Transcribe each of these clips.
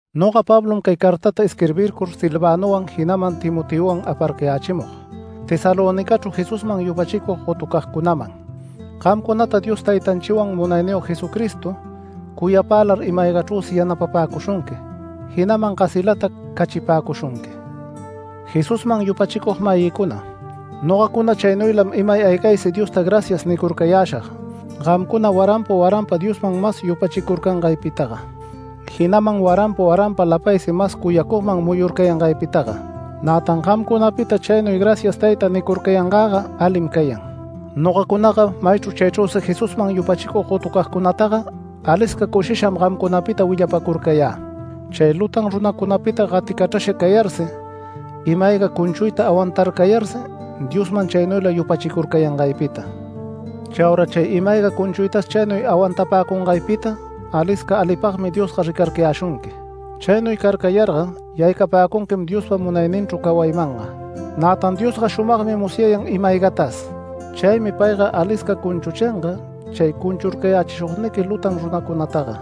Noga Pablom, cay cartata isquirbircur Silvanowan, jinaman Timoteowan aparcayächimug Tesalonicachru Jesusman yupachicug gotucagcunaman. Gamcunata Dios Taytanchiwan Munayniyog Jesucristo cuyapälar ima-aygachrüsi yanapapäcushunqui, jinaman gasilata cachipäcushunqui. Jesusman yupachicug-mayïcuna, nogacuna chaynuylam imay aygaysi Diosta “Gracias” nircurcayäshag gamcuna waranpa waranpa Diosman mas yupachicurcangaypitaga, jinaman waranpa waranpa lapaysi mas cuyacugman muyurcayangaypitaga. Nätan gamcunapita chaynuy “Gracias Tayta” nicurcayangäga alim cayan. Nogacunaga maychru chaychrüsi Jesusman yupachicug gotucagcunataga alisca cushisham gamcunapita willapacurcayä, chay lutan runacunapita gaticachrasha cayarsi, ima-ayga cunchuyta awantarcayarsi Diosman chaynuyla yupachicurcayangaypita. Chaura chay ima-ayga cunchuytas chaynuy awantapäcungaypita alisca alipagmi Diosga ricarcayäshunqui. Chaynuy carcayarga yaycapäcunquim Diospa munayninchru cawaymanga. Nätan Diosga shumagmi musyayan ima-aygatas. Chaymi payga alisca cunchuchinga, chay cunchurcayächishugniqui lutan runacunataga.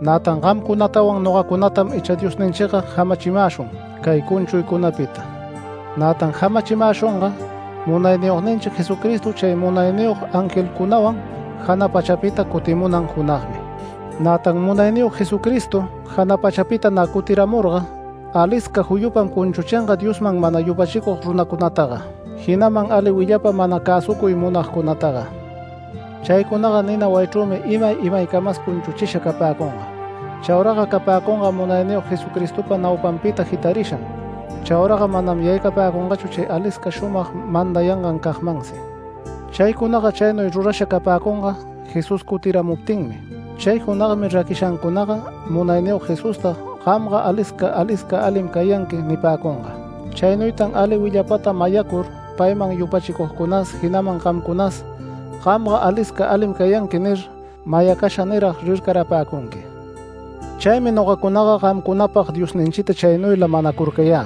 Nätan gamcunatawan nogacunatam icha Diosninchiga jamachimäshun cay cunchuycunapita. Nätan jamachimäshunga Munayniyogninchi Jesucristo chay munayniyog angelcunawan jana pachapita cutimunan junagmi. Nätan Munayniyog Jesucristo jana pachapita nä cutiramurga alisca juyupam cunchuchinga Diosman mana yupachicug runacunataga, jinaman ali willapa mana cäsucuy munagcunataga. Chaycunaga nina wayichrümi imay imaycamas cunchuchisha capäcunga. Chauraga capäcunga Munayniyog Jesucristopa naupanpita jitarisham. Chauraga manam yaycapäcungachu chay alisca shumag mandayangancagmansi. Chaycunaga chaynuy rurasha capäcunga Jesús cutiramuptinmi. Chay junagmi raquishancunaga Munayniyog Jesusta “Gamga alisca alisca alim cayanqui” nipäcunga. Chaynuytan ali willapata mayacur payman yupachicugcunas, jinaman gamcunas “Gamga alisca alim cayanqui” nir, mayacasha nirag rircarapäcunqui. Chaymi nogacunaga gamcunapag Diosninchita chaynuyla manacurcayä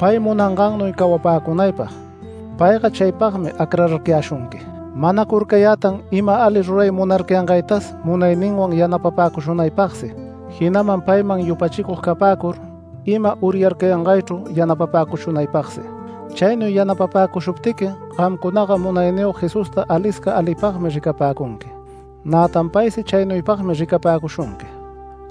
pay munangannuy cawapäcunaypag, payga chaypagmi acrararcayäshunqui. Manacurcayätan ima ali ruray munarcayangaytas munayninwan yanapapäcushunaypagsi, jinaman payman yupachicug capäcur ima uryarcayangaychru yanapapäcushunaypagsi. Chaynuy yanapapäcushuptiqui gamcunaga Munayniyog Jesusta alisca alipagmi ricapäcunqui. Nätan paysi chaynuypagmi ricapäcushunqui.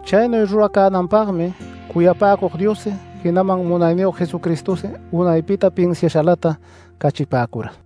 Chaynuy ruracänanpagmi cuyapäcug Diossi, jinaman Munayniyog Jesucristosi unaypita pinsiashalata cachipäcura.